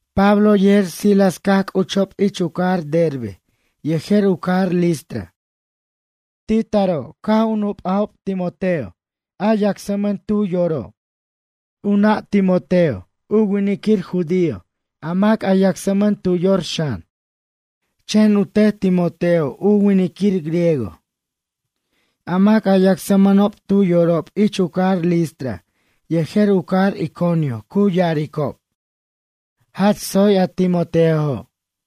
Pablo yejer Silas caj c'uchob ich u cajar Derbe yejer u cajar Listra. Ti taro' caj u nup'ajob Timoteo a yacsmʌn tu yori'. U nʌ' Timoteo u winiquir judío a mac a yacsmʌn tu yor xan, chen u tet Timoteo u winiquir griego. A mac a yacsmʌnob tu yorob ich u cajarob Listra yejer u cajar Iconio cu ya'aricob: “Jach tsoy a Timoteojo'.”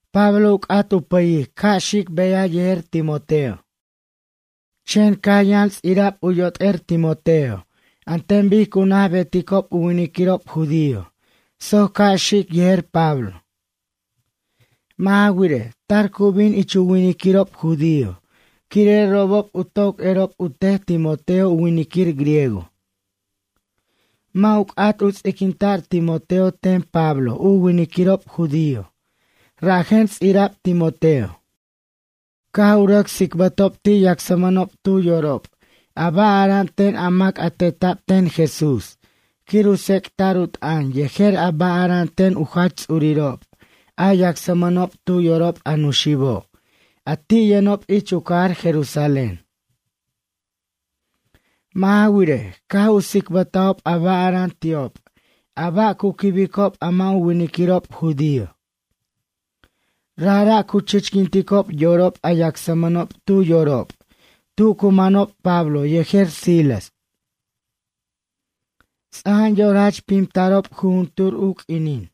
Pablo u c'at u pʌyic ca' xic beyaj yejer Timoteo. Chen caj yʌn ts'ira'b u yot'er Timoteo an ten bic cu naj beticob u winiquirob judío soc ca' xic yejer Pablo. Mʌ' ja wirej, tar cu bin ich u winiquirob judío quire' robob u toc erob u tet Timoteo u winiquir griego. Mʌ' u c'at u ts'iquinta'r Timoteo ten Pablo u winiquirob judío, rajen ts'ira'b Timoteo. Caj u rʌc tsicbʌtob ti' yacsmʌnob tu yorob a ba' ara'an ten a mac a teta'b ten Jesús quir u tsec'ta'r u t'ʌn yejer a ba' ara'an ten u jach ts'urirob a yacsmʌnob tu yorob a nuxibo' a ti' yʌnob ich u cajar Jerusalén. Mʌ' ja wirej, caj u tsicbʌtajob a ba' ara'an ti'ob a ba' ca' u quibob a mʌ' u winiquirob judío. Rajra' cu chichquinticob yorob a yacsmʌnob tu yorob tu cu manob Pablo yejer Silas. Ts'aja'an yor jach pimtarob jujuntur u q'uinin.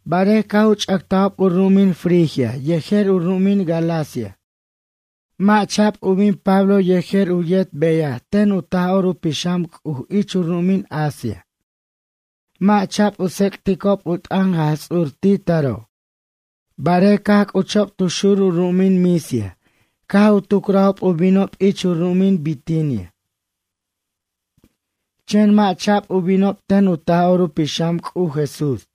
Barej caj u ch'ʌctajob u ru'umin Frigia yejer u ru'umin Galacia, mʌ' cha'b u bin Pablo yejer u yet beyaj ten u Taj'or u Pixam C'uj ich u ru'umin Asia. Mʌ' cha'b u tsec'ticob u t'ʌn Jaj Ts'ur ti taro'. Barej caj c'uchob tu xur u ru'umin Misia, caj u tucrajob u binob ich u ru'umin Bitinia. Chen mʌ' cha'b u binob ten u Taj'or u Pixam C'uj Jesús.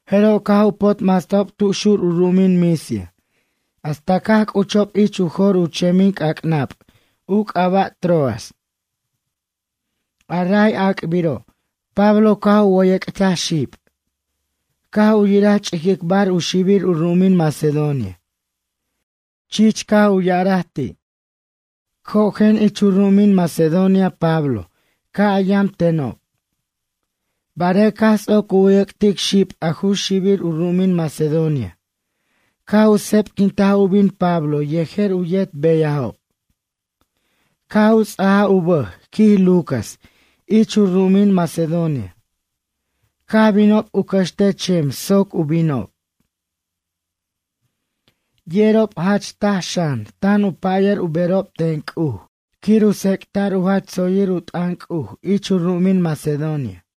Jeroj caj u potmastajob tu xur u ru'umin Misia hasta caj c'uchob ich u jor u chemin c'ac'nab u c'aba' Troas. A ray ac'biro', Pablo caj u wʌyʌc'taj xib. Caj u yiraj ch'iquicbar u xibir u ru'umin Macedonia. Chich caj u ya'araj ti': “Cojen ich u ru'umin Macedonia Pablo ca' a yam tenob.” Barej caj ts'oc u wʌyʌc'tic xib, a ju xibir u ru'umin Macedonia. Caj u sebquintaj u bin Pablo yejer u yet beyajob. Caj u ts'aj u bʌj, quij Lucas, ich u ru'umin Macedonia. Caj binob u cʌxtej chem soc u binob. Yerob jach taj xan, tan u pʌya'r u berob ten C'uj quir u tsec'ta'r u jach tsoyir u t'ʌn C'uj ich u ru'umin Macedonia.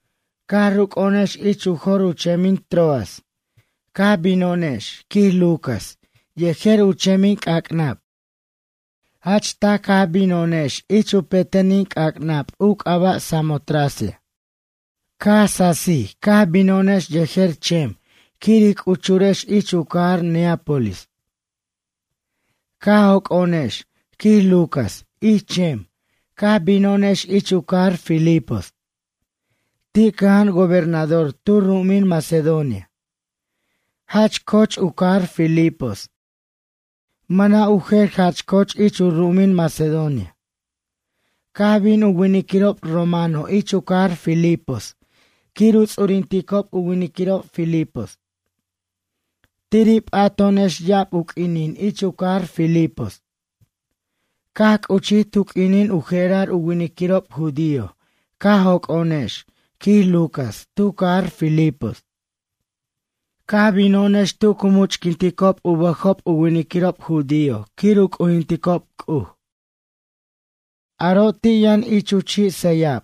Caj ruc'o'onex ich u jor u chemin Troas, caj bino'onex, quij Lucas, yejer u chemin c'ac'nab. Jach taj caj bino'onex ich u petenin c'ac'nab u c'aba' Samotracia. Caj sasij caj bino'onex yejer chem quir ij c'uchurex ich u cajar Neápolis. Caj joc'o'onex, quij Lucas, ich chem, caj bino'onex ich u cajar Filipos. Ti cʌja'an gobernador tu ru'umin Macedonia. Jach co'och u cajar Filipos, mʌna' u jer jach co'och ich u ru'umin Macedonia. Caj bin u winiquirob romano ich u cajar Filipos quir u ts'urinticob u winiquirob filipos. Tiri' p'ato'onex ya'ab u q'uinin ich u cajar Filipos. Caj c'uchij tu q'uinin u je'rar u winiquirob judío caj joc'o'onex, quij Lucas, tu cajar Filipos. Caj bino'onex tu cu much'quinticob u bʌjob u winiquirob judío quir u c'ujinticob C'uj. Aro' ti' yʌn ich chi' sʌyab.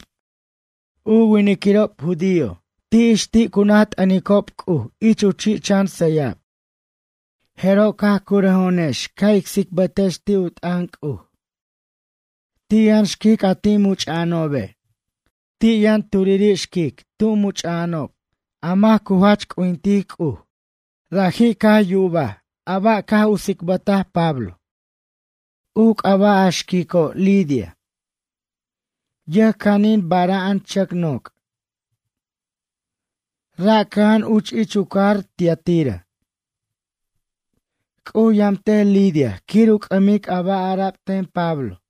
U winiquirob judío ix ti' cu naj t'ʌnicob C'uj ich u chi' chan sʌyab. Jeroj caj curʌjo'onex ca' ic tsicbʌtex ti' u t'ʌn C'uj. Ti' yʌn xquic a ti' much'a'anobe'. Ti' yʌn turiri' xquic tub much'a'anob a mac cu jach c'ujintic C'uj. Raji' yubaj a ba' caj u tsicbʌtaj Pablo. U c'aba' a xquico', Lidia. Yʌjcanin bara'an chʌc noc'. Ra' cʌja'an uch ich u cajar Tiatira. C'uj yamtej Lidia quir u c'ʌmic a ba' ara'b ten Pablo.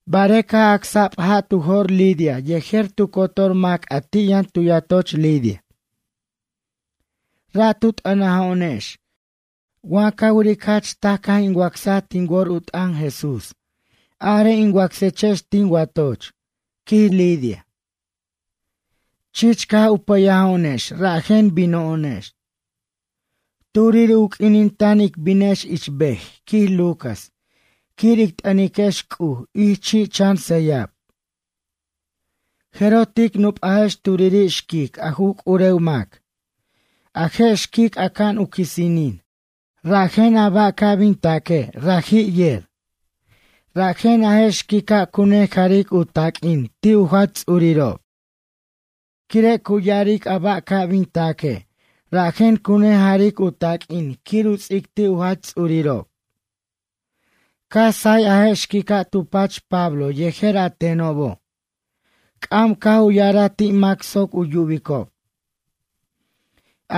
Barej caj acsa'b ja' tu jo'r Lidia yejer tu cotor mac a ti' yʌn tu yatoch Lidia. Ra' tu t'ʌnajo'onex: ―Wa ca wiric jach taj caj in wacsaj tin wor u t'ʌn Jesús, arej in wacsechex tin watoch ―quij Lidia. Chich caj u pʌyajo'onex rajen bino'onex. Turiri' u q'uinin tan ic binex ich ber, quij Lucas, quir ic t'ʌniquex C'uj ich chi' chan sʌyab. Jeroj tic nupajex turiri' xquic a ju c'urew mac. A je' xquic aca'an u quisinin, rajen a ba' ca' bin taque' raji' yer. Rajen a je' xiquica' cu nejaric u taq'uin ti' u jach ts'urirob. Quire' cu ya'aric a ba' ca' bin taque', rajen cu nejaric u taq'uin quir u ts'ic ti' u jach ts'urirob. Caj say a je' xquica' tu pach Pablo yejer a tenobo'. C'am caj u ya'araj ti' mac soc u yubicob: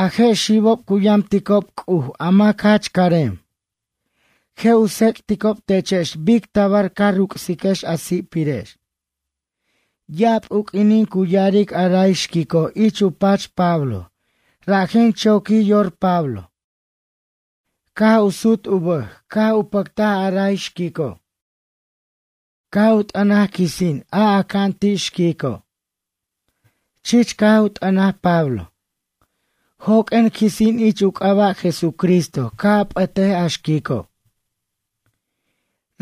―A je' xibob cu yamticob C'uj a mac jach carem. Je' u tsec'ticob techex bic tabar ca ruc'siquex a si'pirex. Ya'ab u q'uinin cu ya'aric a ray xquico' ich u pach Pablo, rajen choquij yor Pablo. Caj u sut u bʌj caj u pʌctaj a ray xquico'. Caj u t'ʌnaj quisin, a aca'an ti' xquico'. Chich caj u t'ʌnaj Pablo: ―Joq'uen quisin ich u c'aba' Jesucristo, ca' a p'ʌtej a xquico'.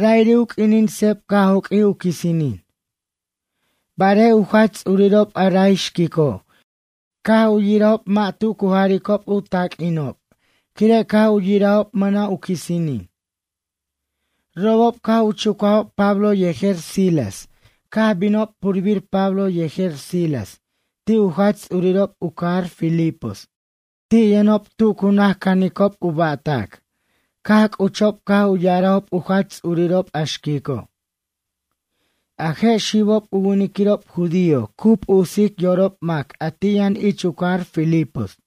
Ra'iri' u q'uinin seb caj joq'uij u quisinin. Barej u jach ts'urirob a ray xquico', caj u yirajob mʌ' tu cu jaricob u taq'uinob, quire' caj u yirajob mʌna' u quisinin. Robob caj u chucajob Pablo yejer Silas caj binob purbir Pablo yejer Silas ti' u jach ts'urirob u cajar Filipos, ti' yʌnob tu cu naj canicob u ba'tac. Caj c'uchob caj u ya'arajob u jach ts'urirob a xquico': ―A je' xibob u winiquirob judío, cu p'usic yorob mac a ti' yʌn ich u cajar Filipos.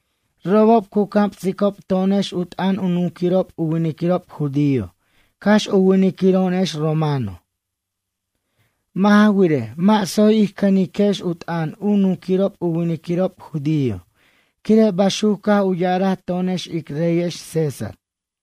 Robob cu camsicob to'onex u t'ʌn u nunquirob u winiquirob judío cax u winiquiro'onex romano. Mʌ' ja wirej, mʌ' tsoy ij cʌniquex u t'ʌn u nunquirob u winiquirob judío, quire' baxuc caj u ya'araj to'onex ic reyex César.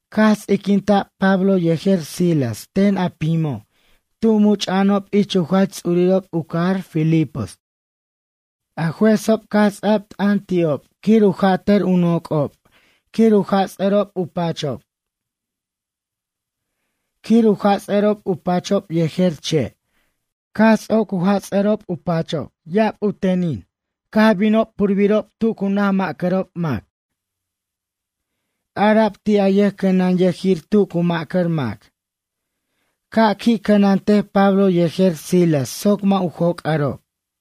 Caj ts'iquinta'b Pablo yejer Silas ten a pimo' tu much'a'anob ich u jach ts'urirob u cajar Filipos. A juezob caj ts'a'b t'ʌn ti'ob quir u jʌtʌr u noc'ob quir u jats'ʌrob u pachob. Quir u jats'ʌrob u pachob yejer che'. Caj ts'oc ya'ab u teninob caj jats' u pachob, caj binob purbirob tu cu naj mʌ'carob mac. Ara'b ti' a yʌjcʌnanyʌjir tu cu mʌ'car mac: ―Ca' qui' cʌnantej Pablo yejer Silas soc mʌ' u joc'arob.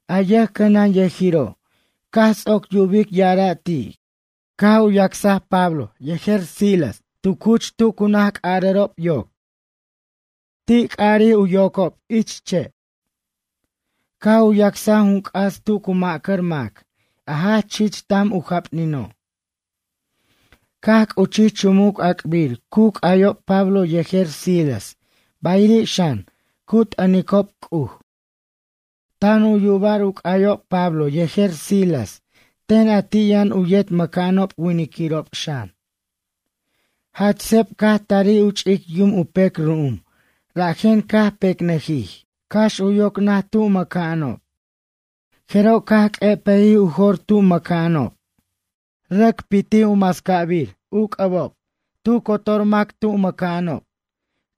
A yʌjcʌnanyʌjiro', caj ts'oc yubic ya'ara' ti', caj u yacsaj Pablo yejer Silas tu cuch c'arʌro' yoc. Ti c'arij u yocob ich che' quir u c'arʌr yocob. Caj u yacsaj jun c'as tu cu mʌ'car mac, a jach ch'ic tam u japnino'. Caj c'uchij chumuc ac'bir cu c'ayob Pablo yejer Silas, bayiri' xan, cu t'ʌnicob C'uj. Tan u'yabar u c'ayob Pablo yejer Silas ten a ti' yʌn u yet mʌ'ca'anob winiquirob xan. Jach seb caj tarij u ch'ic yum u pec ru'um, rajen caj pecnʌjij, cax u yoc naj tu cu mʌ'ca'anob. Jeroj caj q'uepʌjij u jor tu mʌ'c'a'anob. Rʌc pitij u mascabir u c'ʌbob tu cotor mac tu mʌ'ca'anob,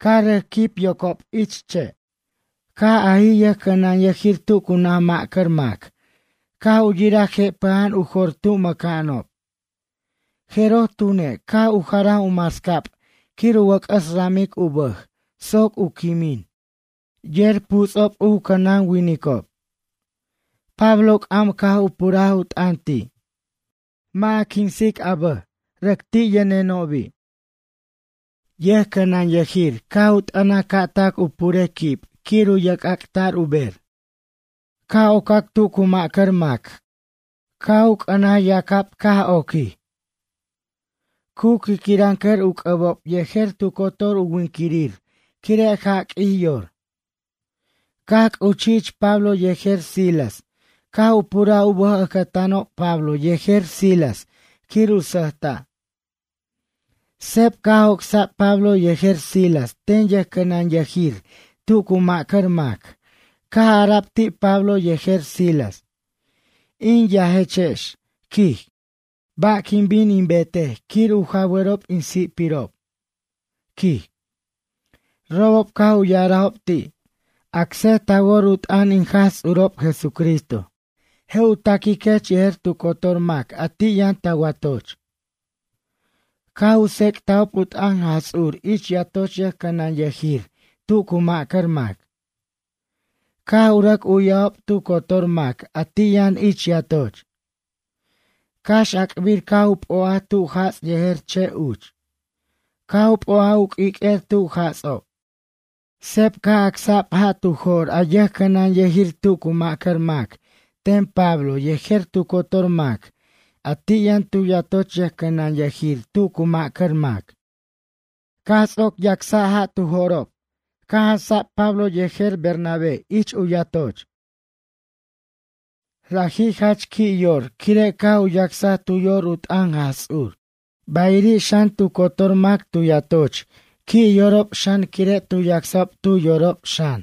caj rʌc quib yocob ich che'. Caj ajij yʌjcʌnanyʌjir tu cu naj mʌ'car mac caj u yiraj jepʌja'an u jor tu mʌ'ca'anob. Jeroj tune', caj u jaraj u mascab quir u wʌc'ʌs ramic u bʌj soc u quimin, yer puts'ob u cʌnanwinicob. Pablo c'am caj u puraj u t'ʌn ti': ―Mʌ' a quinsic a bʌj, rʌc ti' yʌnenobi'. Yʌjcʌnanyʌjir caj u t'ʌnaj ca' tac u purej quib quir u yerc'ac'ta'r u ber. Ca' ocac tu cu mʌ'car mac, caj u c'ʌnaj yacab caj oquij. Cu quiquinrʌncʌr u c'ʌbob yejer tu cotor u winiquirir quire' jaq'uij yor. Caj c'uchij ich Pablo yejer Silas caj u puraj u bʌj ʌcʌtanob Pablo yejer Silas quir u sʌjta'. Seb caj joc'sa'b Pablo yejer Silas ten yʌjcʌnanyʌjir tu cu mʌ'car mac, caj ara'b ti' Pablo yejer Silas: ―In yajechex ―quij―, ba' quin bin in betej quir u jawarob in si'pirob? ―quij. Robob caj u ya'arajob ti': ―Acsej ta wor u t'ʌn in Jaj Ts'urob Jesucristo. Je' u taquiquech yejer tu cotor mac a ti' yʌn ta watoch. Caj u tsec'tajob u t'ʌn Jaj Ts'ur ich yatoch yʌjcʌnanyʌjir tu cu mʌ'car mac. Caj u rʌc u'yajob tu cotor mac a ti' yʌn ich yatoch. Cax ac'bir caj u p'o'aj tu jats' yejer che' uch. Caj u p'o'aj u q'uiq'uer tu jats'ob. Seb caj acsa'b ja' tu jo'r a yʌjcʌnanyʌjir tu cu ma'cʌr mac ten Pablo yejer tu cotor mac a ti' yʌn tu yatoch yʌjcʌnanyʌnir tu cu ma'cʌr mac. Caj ts'oc yacsa'b ja' tu jo'rob caj jansa'b Pablo yejer Bernabé tu yatoch. Raji' jach qui' yor quire' caj u yacsaj tu yor u t'ʌn Jaj Ts'ur. Bayiri' xan, tu cotor mac tu yatoch qui' yorob xan quire' tu yacsajob tu yorob xan.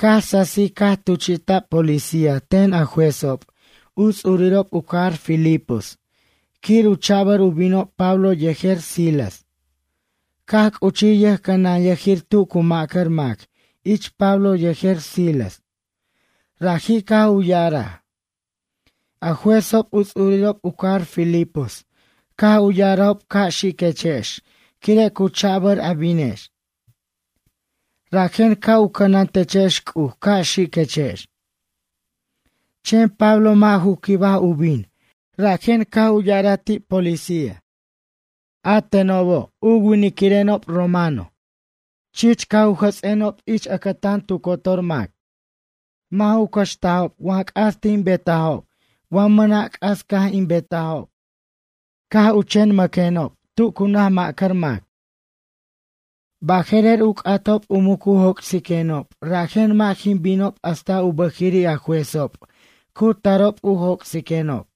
Caj sasij caj tuchi'ta'b policía ten a juezob u ts'urirob u cajar Filipos quir u cha'bʌr u binob Pablo yejer Silas. Caj c'uchij yʌjcʌnanyʌjir tu cu ma'cʌr mac ich Pablo yejer Silas. Raji' caj u ya'araj: ―A juezob u ts'urirob u cajar Filipos caj u ya'arajob ca' xiquechex quire' cu cha'bʌr a binex. Rajen ca' u cʌnantechex C'uj, ca' xiquechex. Chen Pablo mʌ' ju quibaj u bin, rajen caj u ya'araj ti' a policía: ―A teno' u winiquireno' romano, chich u jʌts'eno' ich ʌcʌtan tu cotor mac. Mʌ' ju cʌxtajob wa c'as tin betajo' wa mʌna' c'as caj in betajo'. Caj u chen mʌqueno' tu cu naj ma'cʌr mac. Baje'rer u c'atob u mucu joc'siquenob, rajen mʌ' jin binob hasta u bʌjiri' a juezob cu tarob u joc'siquenob.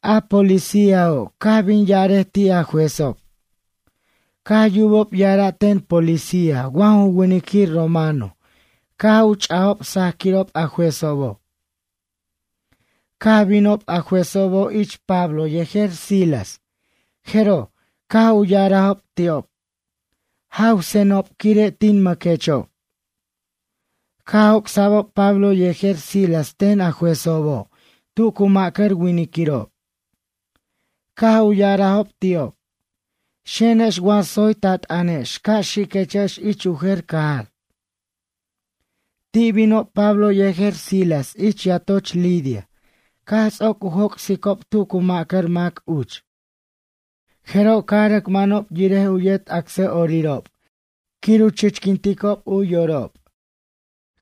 A policíajo', caj bin ya'arej ti' a juezob. Caj u yubob ya'ara' ten policía wa ju winiquir romano, caj u ch'ajob sajquirob a juezobo'. Caj binob a juezobo' ich Pablo yejer Silas, jeroj, caj u ya'arajob ti'ob: ―Jawsenob, quire' tin mʌquechexob. Caj joc'sa'bob Pablo yejer Silas ten a juezobo' tu cu ma'cʌr winiquirob. Caj u ya'arajob ti'ob: ―Xenex wa tsoy ta t'ʌnex, ca' xiquechex ich u jer cajar. Ti' binob Pablo yejer Silas ich yatoch Lidia, caj ts'oc u joc'sicob tu cu ma'cʌr mac uch. Jeroj caj rʌc manob yirej u yet acsa'orirob quir u chichquinticob u yorob.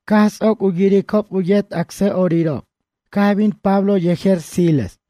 Caj ts'oc u yiricob u yet acsa'orirob, caj bin Pablo yejer Silas.